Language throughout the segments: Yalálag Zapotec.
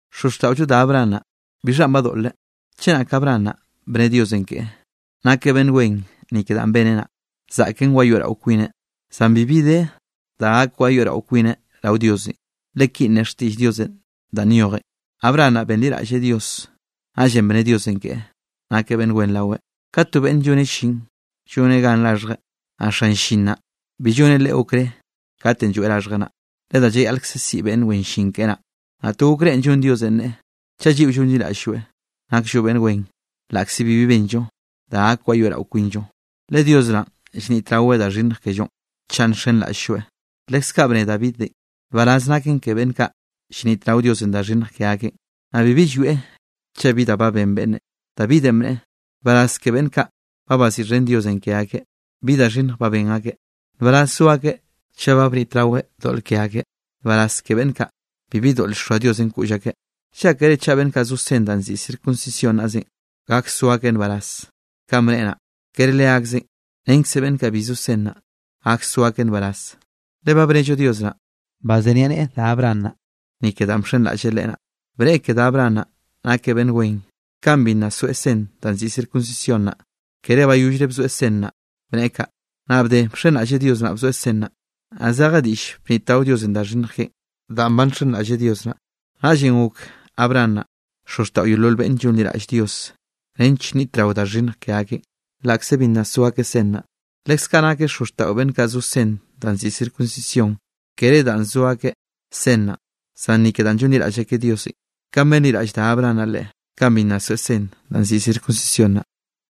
Xozxtaꞌollo da Abraham naꞌ, ¿bixhanꞌ badoꞌleꞌ? Chenak Abraham naꞌ bne Diosenꞌ keꞌe, nakeꞌ beꞌnn wen ni ke danꞌ beneꞌ naꞌ, zaꞌken wayoeꞌrao kwineꞌ, zan bibi de da gak wayoeꞌrao kwineꞌ rao Diosenꞌ. Le kinꞌ ne xtiꞌll Diosenꞌ danꞌ nyojen: “Abraham naꞌ benliraꞌlleꞌ Dios, naꞌllenꞌ bne Diosenꞌ keꞌe, nakeꞌ beꞌnn wen raweꞌ.” Kat to beꞌnne lloneꞌ llin, lloneꞌ gan raxhjeꞌ, naꞌ xan llin naꞌ bi lloneꞌ leꞌe okré kat lloeꞌ raxhjeꞌ naꞌ, le da llayaꞌlkze siꞌi beꞌnn wen llin keꞌe naꞌ. Naꞌ to okrénꞌ llon Diosenꞌ neꞌe, chaꞌ lliꞌo llonliraꞌll-lloeꞌ, nakllo beꞌnn wen laꞌkze bibi benllo da gak wayoeꞌrao kwinllo. Le Dios naꞌn llnitraweꞌ da xhinnj kellonꞌ chaꞌ nxenraꞌll-lloeꞌ. Leskaꞌ bne Davidenꞌ, nbaraz naken ke beꞌnn kaꞌ llnitrao Diosenꞌ da xhinnj ke akeꞌn, naꞌ bibi llwieꞌ chaꞌ bi da ba ben beꞌnne. Davidenꞌ bneꞌe: Nbaraz ke beꞌnn kaꞌ ba baziꞌxhen Diosenꞌ ke akeꞌ, bi da xhinnj ba ben akeꞌ. Nbaraz zo akeꞌ chaꞌ ba bnitraweꞌ doꞌl ke akeꞌ. Nbaraz ke beꞌnn kaꞌ, bibi doꞌl llxoa Diosenꞌ koꞌll akeꞌ. ¿Llákere chaꞌ beꞌnn kaꞌ zo sen da nziꞌi circuncisión naꞌzenꞌ, gak so akeꞌ nbaraz kanꞌ bneꞌe naꞌ? Kere leakzeꞌn, renkze beꞌnn kaꞌ bi zo sen naꞌ, gak so akeꞌ nbaraz, le ba bnello Dios naꞌ, bazeniaꞌneꞌe da Abraham naꞌ, ni ke danꞌ bxenraꞌlleꞌ Leꞌe naꞌ. Bneꞌe ke da Abraham naꞌ, nakeꞌ beꞌnn wen, kanꞌ bi nna soeꞌ sen danꞌ nziꞌi circuncisión naꞌ; kere bayollre bzoeꞌ sen naꞌ bneꞌe kaꞌ. Naꞌ bde bxenraꞌlleꞌ Dios naꞌ bzoeꞌ sen naꞌ, naꞌ zeje diꞌll bnitrao Diosenꞌ da xhinnj keꞌen, danꞌ ba nxenraꞌlleꞌ Dios naꞌ. Naꞌllenꞌ gok Abraham naꞌ, xozxtaꞌo yeolol beꞌnne llonliraꞌll Dios nench nnitrao da xhinnj ke akeꞌn, laꞌkze bi nna so akeꞌ sen naꞌ. Leskaꞌ nakeꞌ xozxtaꞌo beꞌnn kaꞌ zo sen danꞌ nziꞌi circuncisión, kere danꞌ zo akeꞌ sen naꞌ, zan ni ke danꞌ llonliraꞌll akeꞌ Diosenꞌ, kanꞌ benliraꞌll da Abraham naꞌ Leꞌe, kanꞌ bi nna soeꞌ sen danꞌ nziꞌi circuncisión naꞌ.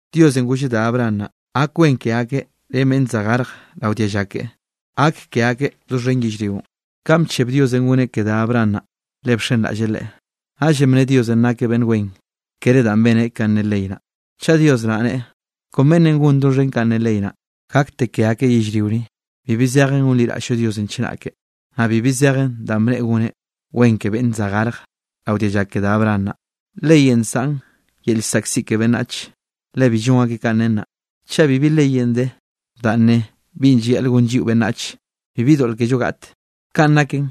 Diosenꞌ golleꞌ da Abraham naꞌ, gak wen ke akeꞌ ren beꞌnn za garjeꞌ rao dialla keꞌe, gak ke akeꞌ doxhen yellrionꞌ. Kaꞌn bcheb Diosenꞌ goneꞌ ke da Abraham naꞌ, le bxenraꞌlleꞌ Leꞌe. Naꞌllenꞌ bne Diosenꞌ nakeꞌ beꞌnn wen, kere danꞌ beneꞌ kanꞌ ne ley naꞌn. Chaꞌ Dios naꞌ nneꞌe kon beꞌnne gon doxhen kanꞌ ne ley naꞌ, gakte ke akeꞌ yellrio ni, bibi zejen gonliraꞌll-llo Diosenꞌ chenake, naꞌ bibi zejen danꞌ bneꞌe goneꞌ wen ke beꞌnne za garjeꞌ rao dialla ke da Abraham naꞌ. Leyenꞌ nsaꞌn yel llzaꞌkziꞌ ke beꞌnnach, le bi llon akeꞌ kanꞌ nen naꞌ. Chaꞌ bibi leyenꞌ de, danꞌ ne binꞌ llayaꞌl gon lliꞌo beꞌnnach, bibi doꞌl kello gaꞌte. Kanꞌ naken,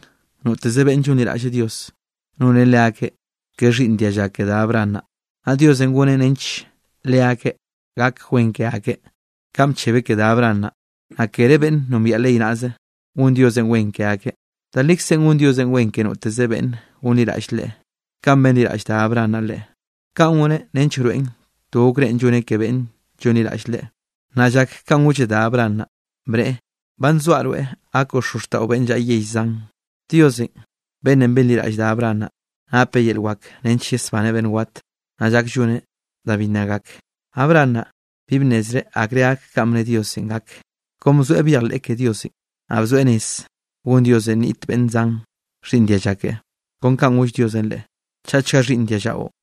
noteze beꞌnne llonliraꞌlle Diosenꞌ, noneꞌ leakeꞌ ka xhiꞌnn dialla ke da Abraham naꞌ, naꞌ Diosenꞌ goneꞌ nench leakeꞌ gak wen ke akeꞌ kanꞌ bchebeꞌ ke da Abraham naꞌ. Naꞌ kere beꞌnn nombiaꞌ ley naꞌze, gon Diosenꞌ wen ke akeꞌ. Da likzenꞌ gon Diosenꞌ wen ke noteze beꞌnne gonliraꞌll Leꞌe, kanꞌ benliraꞌll da Abraham naꞌ Leꞌe. Kaꞌn goneꞌ nench wroeꞌn to okrénꞌ lloneꞌ ke beꞌnne llonliraꞌll Leꞌe. Naꞌ llak kanꞌ golleꞌ da Abraham naꞌ, bneꞌe: “Ba nzoaꞌ rweꞌ gakoꞌ xozxtaꞌo beꞌnn llaꞌa yell zan.” Diosenꞌ beꞌnnenꞌ benliraꞌll da Abraham naꞌ, napeꞌ yel wak nench yesbaneꞌ beꞌnn wat, naꞌ llak lloneꞌ da bi nna gak. Abraham naꞌ bi bnnezreꞌ akre gak kanꞌ bne Diosenꞌ gak, kon bzoeꞌ byejleꞌ ke Diosenꞌ, naꞌ bzoeꞌ rez gon Diosenꞌ nniꞌt beꞌnn zan xhiꞌnn dialla keꞌe. Kon kanꞌ goll Diosenꞌ leꞌe: “Chaꞌchga xhiꞌnn diallaꞌo.”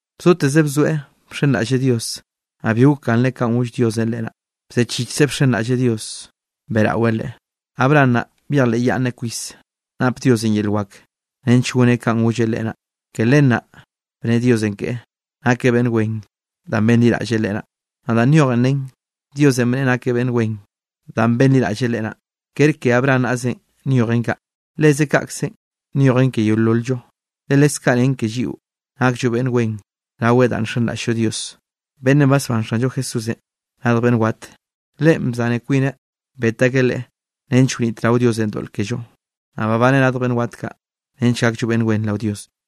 Bzoteze bzoeꞌ bxenraꞌlleꞌ Dios, naꞌ bi gokganreꞌ kanꞌ goll Diosenꞌ leꞌe naꞌ, bzechichkzeꞌ bxenraꞌlleꞌ Dios beꞌraweꞌ Leꞌe. Abraham naꞌ byejleꞌyaꞌnneꞌ kwis nap Diosenꞌ yel wak nench goneꞌ kanꞌ golleꞌ leꞌe naꞌ. Ke len naꞌ bne Diosenꞌ keꞌe, nakeꞌ beꞌnn wen danꞌ benliraꞌlleꞌ Leꞌe naꞌ. Naꞌ danꞌ nyojen nen, Diosenꞌ bneꞌe nakeꞌ beꞌnn wen danꞌ benliraꞌlleꞌ Leꞌe naꞌ, kere ke Abraham naꞌzenꞌ nyojen kaꞌ. Leze kaꞌkzenꞌ nyojen ke yeolol-llo, le leskaꞌ nen ke lliꞌo nakllo beꞌnn wen raweꞌn danꞌ nxenraꞌll-llo Dios, beꞌnnenꞌ basbán Xanllo Jesúsenꞌ radj beꞌnn wat. Leꞌe bzaneꞌ kwineꞌ bet akeꞌ Leꞌe nench wnitrao Diosenꞌ doꞌl kello, naꞌ babaneꞌ radj beꞌnn wat nench gakllo beꞌnn wen rao Diosenꞌ.